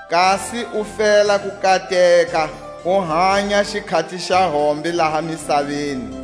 kasi u fela ku kateka, u hanya xikhati xa hombe laha misaveni.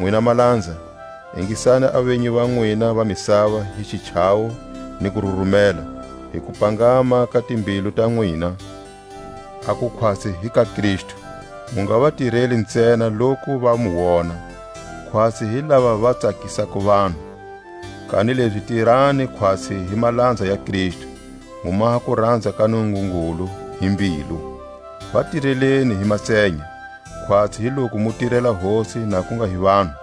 Nwina malanza, ingisani a venyi va nwina va misava hi xichavo ni kururumela, hi kupangama ka timbilu ta nwina, aku khwatsi hi ka Kristu mu nga va tireli ntsena loku va mu wona, khwatsi hi lava va tsakisako vanhu; kanilezi tirani khwatsi hi malanza ya Kristu, mu maha kuranza ka Nungungulu hi mbilu. Va tireleni hi matsenya, khwatsi hi loku mu tirela Hosi na ku nga hi vanhu.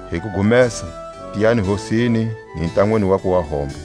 Hi kugumesa, tiyani Hosini, ni ntanwini wakwe wa hombe.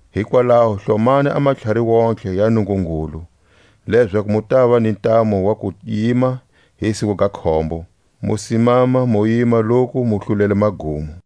Hikwalaho hlomani a matlhari wontihe ya Nungungulu, lezaku mu tava ni ntamu wa ku yima hi siku ga khombo, mu simama mu yima loku mu hlulele magumo.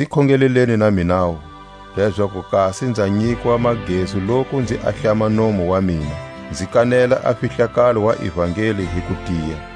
Nzi khongeleleni na minawu, lezaku kasi nza nyikwa magezu loku nzi ahlama nomu wa mina, nzi kanela a fihlakalo wa ivangeli hi kutiya,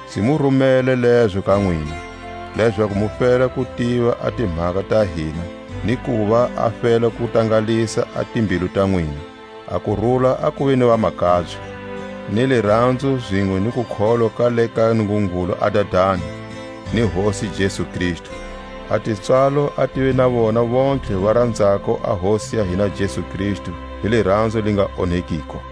Nzi mu rumele lezo ka nwina, lezaku mu fela ku tiva a timhaka ta hina, ni kuva a fela ku tangalisa a timbilu ta nwina. A kurula a kuve ni vamakabye, ni liranzo zinwe ni kukholwa ka le ka Nungungulu a Dadani, ni Hosi Jesu Kristu. A tipswalo a tive na vona vontlhe va ranzako a Hosi ya hina Jesu Kristu hi liranzo li nga onhekiko.